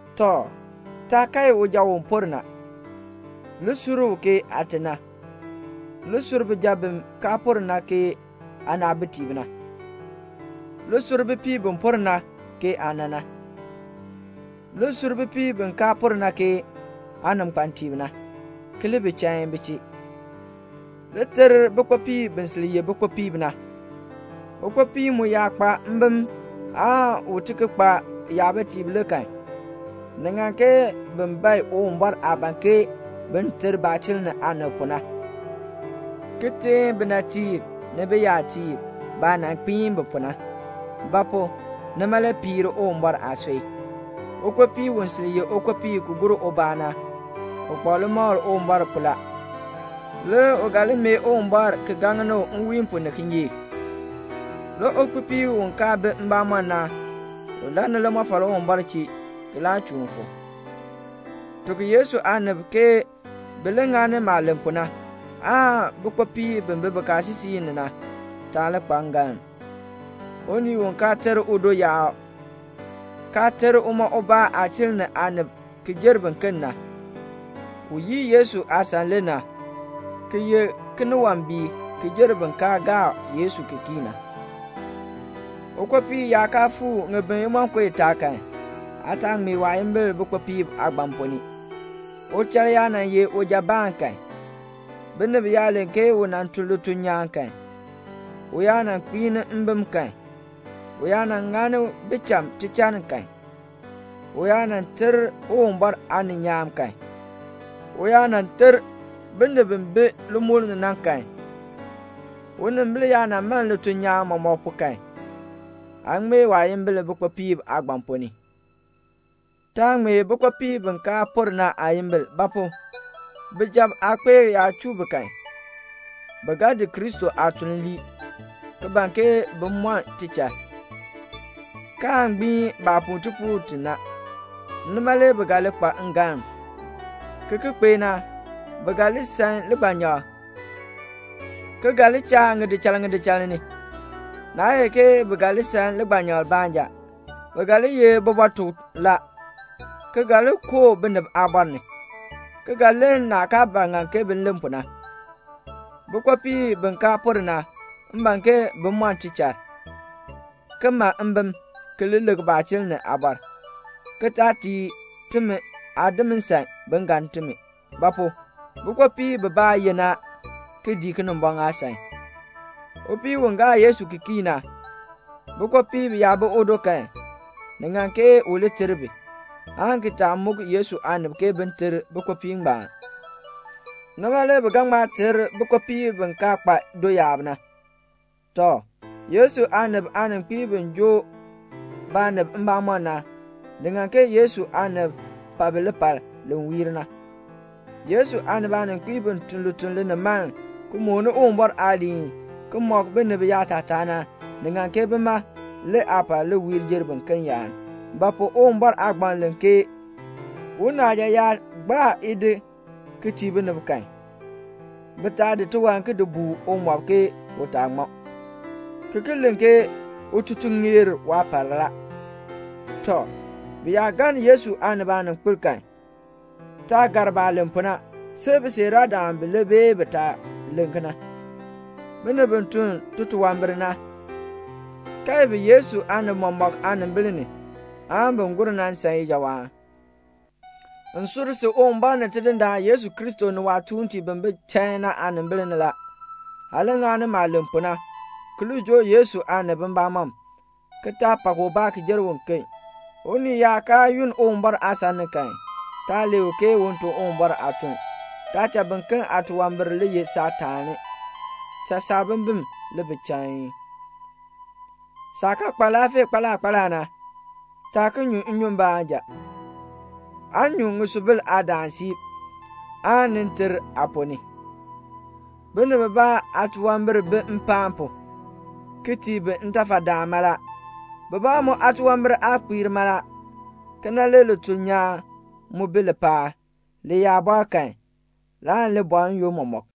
Tɔ, taa kae uja u por na. Li sur u ke aate na. Li sur bijab bi kaa por na ke aanaabitiib na. Li sur bipiib bi por na ke aana na. Li sur bipiib bi kaa por na ke aaninkpatiib na, ki li bi chain bi chee. Li ter bikpopiib bi sil ye bikpopiib na. Ukpopii mu yaa kpa mbim aan u ti ki kpa yabitiib le kan, ni ŋan ke bin bae Uwumbɔr aah ban ke bin ter baachiln ni aanib pu na, ki teen binatiib ni biyatiib baah nan kpiin bi pu na; ba pu? nima le piir Uwumbɔr aasui. Ukpopii u sil ye ukpopii ki gur ubaa na, u kpa limakl Uwumbɔr pu la. Le u ga li mee Uwumbɔr ki gaŋni u nwiin pu ni kinyeek. Le ukpopii u kaa bi mbamɔm na, u lann limɔfal Uwumbɔr chee ki laa chuun fu. Tuk Yesu aanib ke bi li ŋani maah len pu na, aan bikpopiib bi bi bikaasisik ni na taa li kpa ngalm. Unii u kaa ter udo yaab, kaa ter uma ubaa aachiln ni aanib ki jer biken na, u yii Yesu aasan le na, ki ye kiniwambiik ki jer bin kaa gaa Yesu ki kii na. Ukpopii yaa kaa fuu ŋibin imonko itaa kan, aa taa ŋmee waayimbil bikpopiib aagbaŋ ponn ni. Uchal yaa nan ye ujabaan kan, binib yaa len ke u tun lituln nyaan kan, u yaa nan kpiini mbim kan, u yaa nan ŋani bicham tichann kan, u yaa nan ter Uwumbɔr aaninyaan kan, u yaa nan ter binib bi bi limukl ni na kan, unimbil yaa man lituln nyaan mɔmɔk pu kan, aa ŋmee waayimbil bikpopiib aagbaŋ ponn ni. Taa ŋmee bikpopiib bi kaa por na aayimbil; ba pu? bijab aakpeek yaa chuu bi kan, bi ga di Kristo aatuln lii, ki ban ke bin mɔn tichal, kaan gbiin baah puu tipuul ti na. Nima le bi ga li kpa ngalm. Ki ki cha, bi ga li san ligbanyakl, ki ga buen ŋidichal ŋidichal ni. Naa ye ke bi ga li san ligbanyakl baanja, bi ga li ye bibɔtukb la, ki ga li koo binib aabɔr ni, ki ga len naah kaa ba ŋan bi len pu na. Bikpopiib bi kaa por na, m ban ke bin mɔn tichal, ki ma mbim, ki li lik baachiln ni aabɔr, ki taa tii timi aadim nsan bin galn timi. Ba pu? bikpopiib bibaa yenn a, ki dii Kinimbɔŋ aasan. Upii u gaa Yesu ki kii na, bikpopiib yaa bi udo kan, ni ŋan ke u li ter bi, aan ki taa muk Yesu aanib ke bin ter bikpopiib ngbaan. Nima le bi ga ŋma ter bikpopiib bi kaa kpa doyaab na. Tɔ, Yesu aanib aaninkpiib bi joo baanib mbamɔm na, ni ŋan ke Yesu aanib pa bi lipal li wiir na. Yesu aanib aaninkpiib bi tun lituln linimaln, ki mooni Uwumbɔr aaliin, ki mɔk binib yaatataa na, ni ŋan ke bima le aapar li wiir jer biken yaan. Ba pu? Uwumbɔr aagbaŋ len ke, "Unaaja yaa taa gbaa idi ki tii binib kan, bi taa di tiwan ki di buu umɔb ke u taa ŋmɔ," ki ki len ke "Ututuln ŋeer waapar la." Tɔ, bi yaa galn Yesu aanib aaninkpil kan, taa gar baah len pu na, see bisiiraadam bilee bee bitaa len. Binib bi tun titunwambir na, kae bi Yesu aanib mɔmɔk aanimbil ni, aan bin gur na san ijawaan. M sur si Uwumbɔr ni Tidindaan Yesu Kristo ni waatuuntiib bi bi chain na aanimbil ni la, aa li ŋani maah len pu na, ki li joo Yesu aanib mbamɔm, ki taa pak ubaa ki jer uken. Unii yaa kaa yunn Uwumbɔr aasan ni kan, taa lee u un tun Uwumbɔr aatuln. Taa cha biken aatunwambir li ye saataani. Cha saabimbin li bi chain. Saah kaa kpa laafee kpaala kpaala na, taa ki nyu nnyun baanja, aa nyu ŋisubil aadaan siib, aan ni ter aaponn ni. Binib bibaa aatunwambir bi mpaan pu, ki tii bi ntafadaan mala. Bibaa mu aatunwambir aa kpiir mala. Kena, le lituln nyaan mu bi lipaal. Li yaa bɔɔ kan, laan li bɔɔ n-yoonn mɔmɔk.